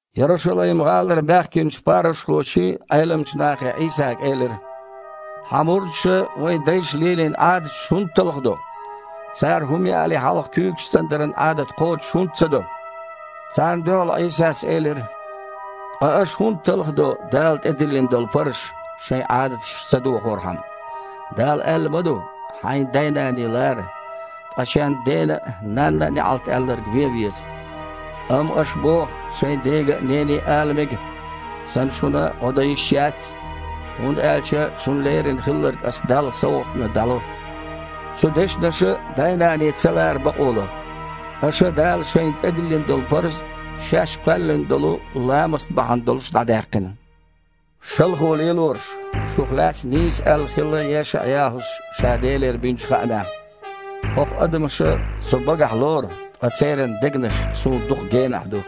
Ярушалайм-гІалара баьхкинчу парушхоший, Іеламчу нахий Іийсага элира: «Хьан мурдаша вайн дайша лелийна Іадаташ хІунда талхадо? Цара хІума яале хьалха куьйгаш цІандаран Іадат кхочуш хІунда ца до?!» Царна дуьхьал Іийсас элира: «Ткъа аша хІунда талхадо Дала тІедиллина долу парзаш, шайн Іадаташ ца дохорхьама? Дала аьлла ма ду: „Хьайн дай-наний лара“, ткъа „Шен дена я нанна неІалт аьлларг вен веза“. Амма аша боху шайн дега а, нене а ала мега: „Сан шуна гІо дан йиш яц, хІунда аьлча шуна лерина хилларг аса Далла совгІатна дІало“. Цу дешнаша дай-наний ца лара бакъо ло. Аша Дала шайна тІедиллина долу парз шаьш кхоьллина долу ламаст бахьана долуш дІадаьккхина. Шалхо лелорш! Шух лаьцна нийса аьлла хилла ЕшаІ-ЯхІус ша Делера бинчу хаамехь: „ХІокху адамаша Со багахь лору, ткъа церан дегнаш Суна дукха генахь ду.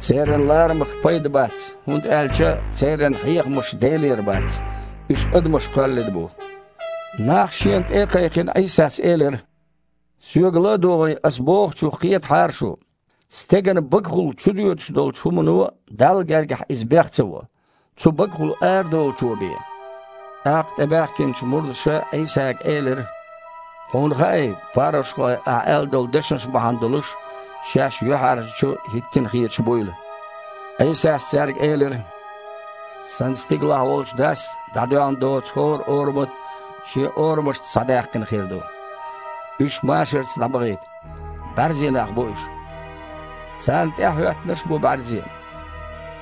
Церан ларамах пайда бац, хІунда аьлча церан хьехамаш Делера бац, уьш адамаша кхоьллина бу“». Нах Шена тІе а кхайкхина, Іийсас элира: «Соьга ла а догІий, Аса бохучух кхетахьара шу: стеган багахула чудоьдуш долчу хІумано Далла гергахь иза бех ца во, цу багахула арадолучо бен». ТІаккха тІебаьхкинчу мурдаша Іийсага элира: «Хьуна хаьий парушхой Ахьа аьлла долу дешнаш бахьана долуш шаьш юьхьІаьржачу хІиттина хеташ буйла?» Іийсас цаьрга элира: «Сан стигалахь волчу Дас дІадоьгІна доцу хІора орамат шен орамашца схьадаьккхина хир ду. Уьш машарца дІабахийта. БІаьрзе нах бу уьш. Царна тІаьхьахІоьттинарш а бу бІаьрзе.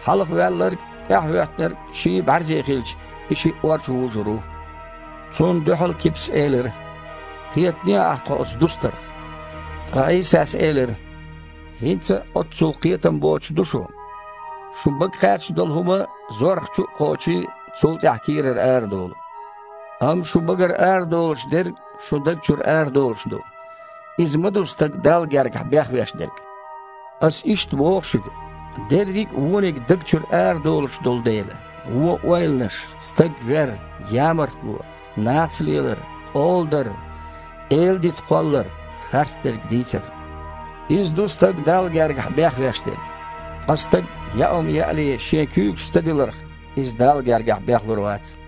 Хьалха ваьлларг а, тІаьхьахІоьттинарг а, ший а бІаьрзе хилча, и шиъ ор чу вужур ву». Цунна дуьхьал Кипас элира: «Кхетадехьа Ахьа тхо оцу дустарх». Ткъа Іийсас элира: «ХІинца а оццул кхетам боцуш ду шу? Шун бага кхаьчна долу хІума, зорх чу а кхочий, цул тІаьхьа кийрара арадолу. Амма шун багара арадолуш дерг шун даг чуьра арадолуш ду. Иза ма ду стаг Далла гергахь бехвеш дерг. Аса иштта боху шуьга, дерриг а вониг даг чуьра арадолуш долу дела: вон ойланаш, стаг вер, ямартло, нахаца лелар, къола дар, эладита кхоллар, харцдерг дийцар. Иза ду стаг Далла гергахь бехвеш дерг. Ткъа стага яа хІума яале шен куьйгаш ца диларх, иза Далла гергахь бехлур вац».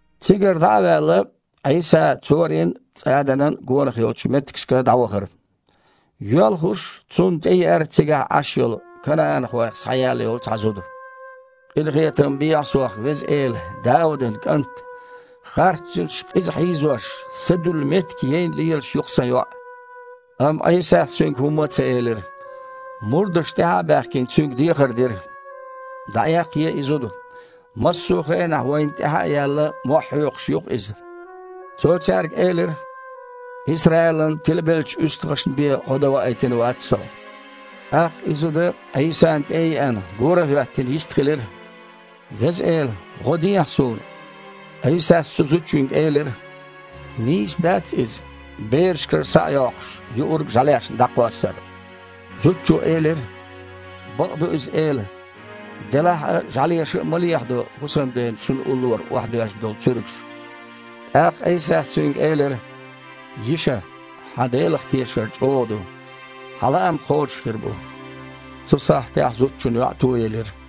Цигара дІа а ваьлла, Іийса Цорин а, ЦІаданан а гонах йолчу меттигашка дІавахара. Йоьлхуш, Цунна тІееара цигахь Іаш йолу канаІанхойх схьаяьлла йолу цхьа зуда: «Къинхетам бехьа сох, Веза Эла, Даудан КІант! Харцжинаша къиза хьийзош, са дуьллу меттиг яйна лелаш ю-кх сан йоІ». Амма Іийсас цуьнга хІумма а ца элира. Мурдаша, тІаьхьа а баьхкина, Цуьнга дехар дира: «ДІаэккхае и зуда! Массо а хенахь вайна тІаьхьа а яьлла, мохь хьоькхуш ю-кх». Цо цаьрга элира: «Исраилан тилабеллачу уьстагІашна бен гІо дан ваийтина вац Со». ТІаккха и зуда, Іийсана тІе а еана, гора а хІоьттина, йистхилира: «Веза Эла! ГІо дехьа суна!» Іийсас цу зудчуьнга элира: «Нийса дац иза, берашкара схьа а йоккхуш, юург жІаьлешна дІакхоссар». Зудчо элира: «Бакъ ду иза, Эла! Делахь а жІаьлеша а ма лехьадо хІусамден шуьн уллора охьадоьжна долу цуьргаш». ТІаккха Іийсас цуьнга элира: «Йиша, хьан Делах тешар чІогІа ду! Хьан лаам кхочуш хир бу!» Цу сахьтехь зудчун йоІ тоелира.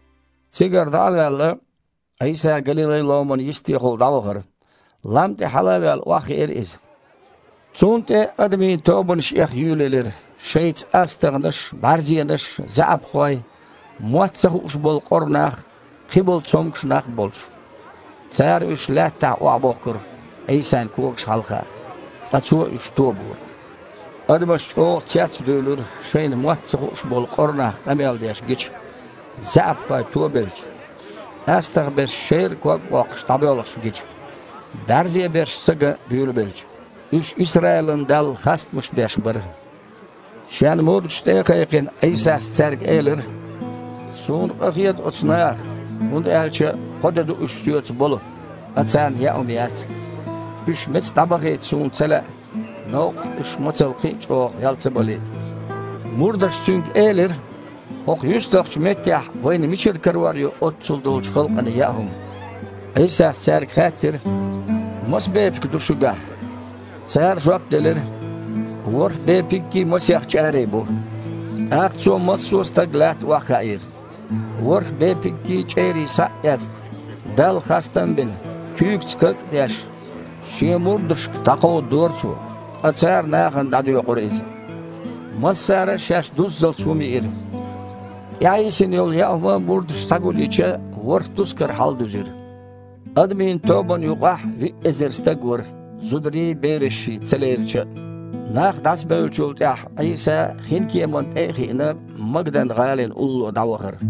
Цигара дІа а ваьлла, Іийса Галилай-Іоман йистехула дІавахара. Лам тІе хьала а ваьлла, охьахиира Иза. Цунна тІе адамийн тобанаш эха юьйлаелира, шайца астагІнаш, бІаьрзенаш, заьІапхой, мотт ца хууш болу къора нах, кхиболу цомгуш нах а болуш. Цара уьш лаьттахь охьабохкура, Іийсан когаш хьалха. Ткъа Цо уьш тобора. Адамаш чІогІа цецдуьйлура шайна мотт ца хууш болу къора нах къамел деш гича, заьІапхой тобелча, астагІа берш, шерра ког а боккхуш, дІабоьлхуш гича, бІаьрзе берш са ган буьйлабелча. Уьш Исраилан Далла хастамаш беш бара. Шен мурдаш тІе а кхайкхина, Іийсас цаьрга элира: «Суна къахета оцу нахах, хІунда аьлча кхо де а ду уьш Соьца болу, ткъа царна яа хІума яц. Уьш меца дІабахийта Суна ца лаьа, новкъахь уьш мацалла кхин а чІогІа гІел ца балийта». Мурдаша Цуьнга элира: «ХІокху юьстахчу меттехь вайна мичара карор ю оццул долчу халкъана яа хІума?» Іийсас цаьрга хаьттира: «Маса бепиг ду шуьгахь?» Цара жоп делира: «ВорхІ бепиггий, масех чІарий бу». ТІаккха Цо массо а стаг лаьтта охьахаийра. ВорхІ бепиггий, чІерий схьа а эцна, Далла хастам а бина, куьйгаца каг а деш, Шен мурдашка кховдадора Цо, ткъа цара нахана дІадоькъура иза. Массара а шаьш дуззалц хІума йиира. ТІаьхьайисина йолу яа хІума мурдаша схьагулйича, ворхІ тускар хьаладуьзира. Адамийн тобанна юкъахь виъ эзар стаг вара, зударий, берашший ца лерича а. Нах дІасабевллачул тІаьхьа Іийса, хинкеманна тІе а хиъна, Магдан-гІалина улло дІавахара.